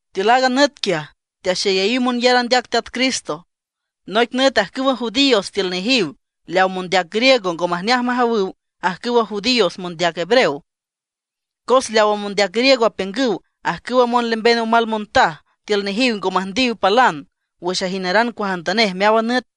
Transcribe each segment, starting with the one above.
Tiül aaga nüt quiaj, teaxeyayiw monyar andeac Teat Cristo. Noic nüt ajcüwa judíos tiül nejiw leaw mondeac griego ngo majneaj majawüw ajcüwa judíos mondeac hebreo. Cos leawa mondeac griego apiüngüw ajcüwa monlemben omal montaj tiül nejiw ngo müjndiw palan wüx ajineran cuajantanej meáwan nüt.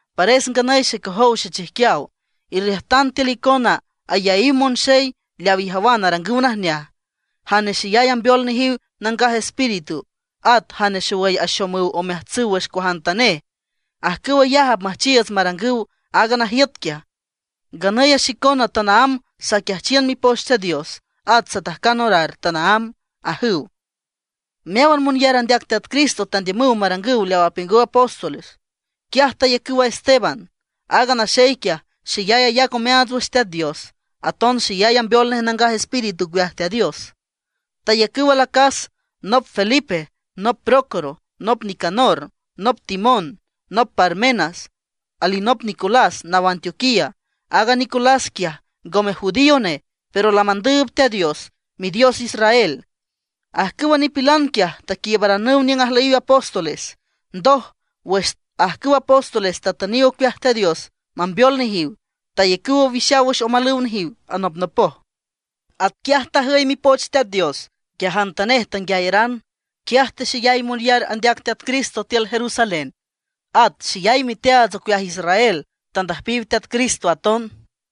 Pares nganüy xecojow xechijquiaw, irriüjtan tiül icona ayaíw monxey leaw ijawan arangüw najneaj, jane xeyay ambeol nejiw Nangaj Espíritu, at jane xowüy axomüw omeajtsüw wüx cuajantanej. Ajcüw ayaj apmüjchiiüts marangüw aaga najiüt quiaj. Nganüy a xicona tanaámb saquiajchiün Mipoch Teat Dios, at satajcan orar tanaámb ―ajüw. Meáwan monyar andeac Teat Cristo tandiümüw marangüw leaw apiüngüw apóstoles. Quiaj tayacüw a Esteban. Aaga naxey quiaj, xeyay ayac omeaats wüx Teat Dios, aton xeyay ambeol nej Nangaj Espíritu ocueaj Teat Dios. Tayacüw alacas, nop Felipe, nop Prócoro, nop Nicanor, nop Timón, nop Parmenas, alinop Nicolás naw Antioquía. Aaga Nicolás quiaj ngome judío nej, pero lamandüüb Teat Dios, Midios Israel. Ajcüwa nipilan quiaj taquiiübaranüw niüng ajlüyiw apóstoles. Ndoj, wüx ajcüw apóstoles tatüniw ocueaj Teat Dios mambeol nejiw, tayacüw owixaw wüx omalüw nejiw anopnopoj. Atquiaj tajüy Mipoch Teat Dios, nguiajantanej tanguiayaran. Quiaj texeyay monyar andeac Teat Cristo tiül Jerusalén, at xeyay miteaats ocueaj israel tandüjpiw Teat Cristo aton.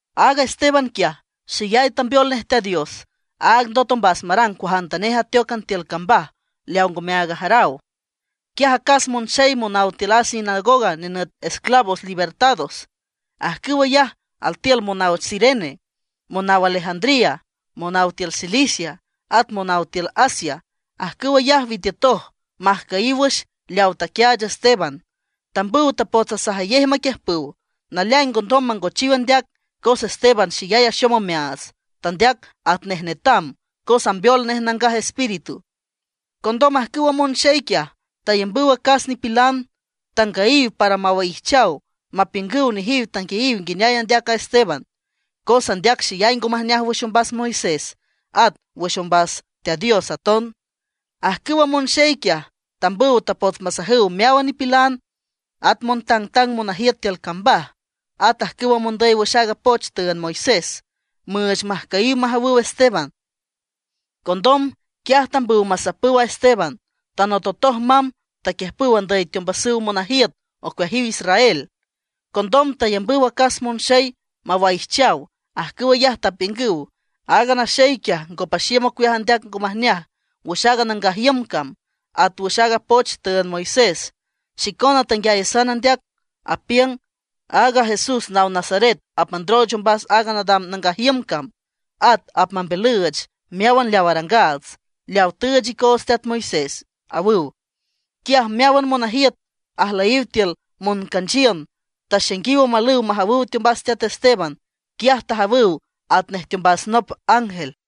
Aaga Esteban quiaj, xeyay tambeol nej Teat Dios. Áag ndot ombas marang cuajantanej ateócan tiül cambaj leaw ngome aag ajaraw. Quiaj acas monxey monaw tiül a sinagoga nenüt Esclavos Libertados, ajcüw ayaj altiül monaw Cirene, monaw Alejandría, monaw tiül Cilicia, at monaw tiül Asia. Ajcüw ayaj witiütoj majcüyiw wüx leaw taquiaach Esteban. Tambüw tapots asajayej maquiüjpüw. Naleaing ngondom mangochiw andeac, cos Esteban xeyay axom omeaats, tandeac atnej netam, cos ambeol nej Nangaj Espíritu. Condom ajcüwa monxey quiaj, tayambüw acas nipilan, tangüyiw para mawaijchaw mapiüngüw nejiw tanguiayiw nguineay andeac aaga Esteban, cos andeac xeyay ngo majneaj wüx ombas Moisés at wüx ombas Teat Dios aton. Ajcüwa monxey quiaj, tambüw tapots masajüw meáwan nipilan, at montangtang monajiüt tiül cambaj, at ajcüwa mondüy wüx aaga poch tüünd Moisés, müüch majcüyiw majawüw Esteban. Condom, quiaj tambüw masapüw a Esteban, tanototoj mamb taquiüjpüw andüy teombasüw monajiüt ocueajiw Israel. Condom tayambüw acas monxey mawaijchaw. Ajcüw ayaj tapiüngüw: ―Aaga naxey quiaj ngo paxiüm ocueaj andeac ngo majneaj wüx aaga nangaj iüm cam at wüx aaga poch tüünd Moisés. Xicona tanguiayasan andeac, apiüng aaga Jesús naw Nazaret apmandrooch ombas aaga nadam nangaj iüm cam, at apmambiülüüch meáwan leaw arangaats, leawa tüüch icoots teat Moisés ―awüw. Quiaj meáwan monajiüt ajlüyiw tiül moncanchiün taxainguiw omalüw majawüw teombas teat Esteban. Quiaj tajawüw atnej teombas nop ángel.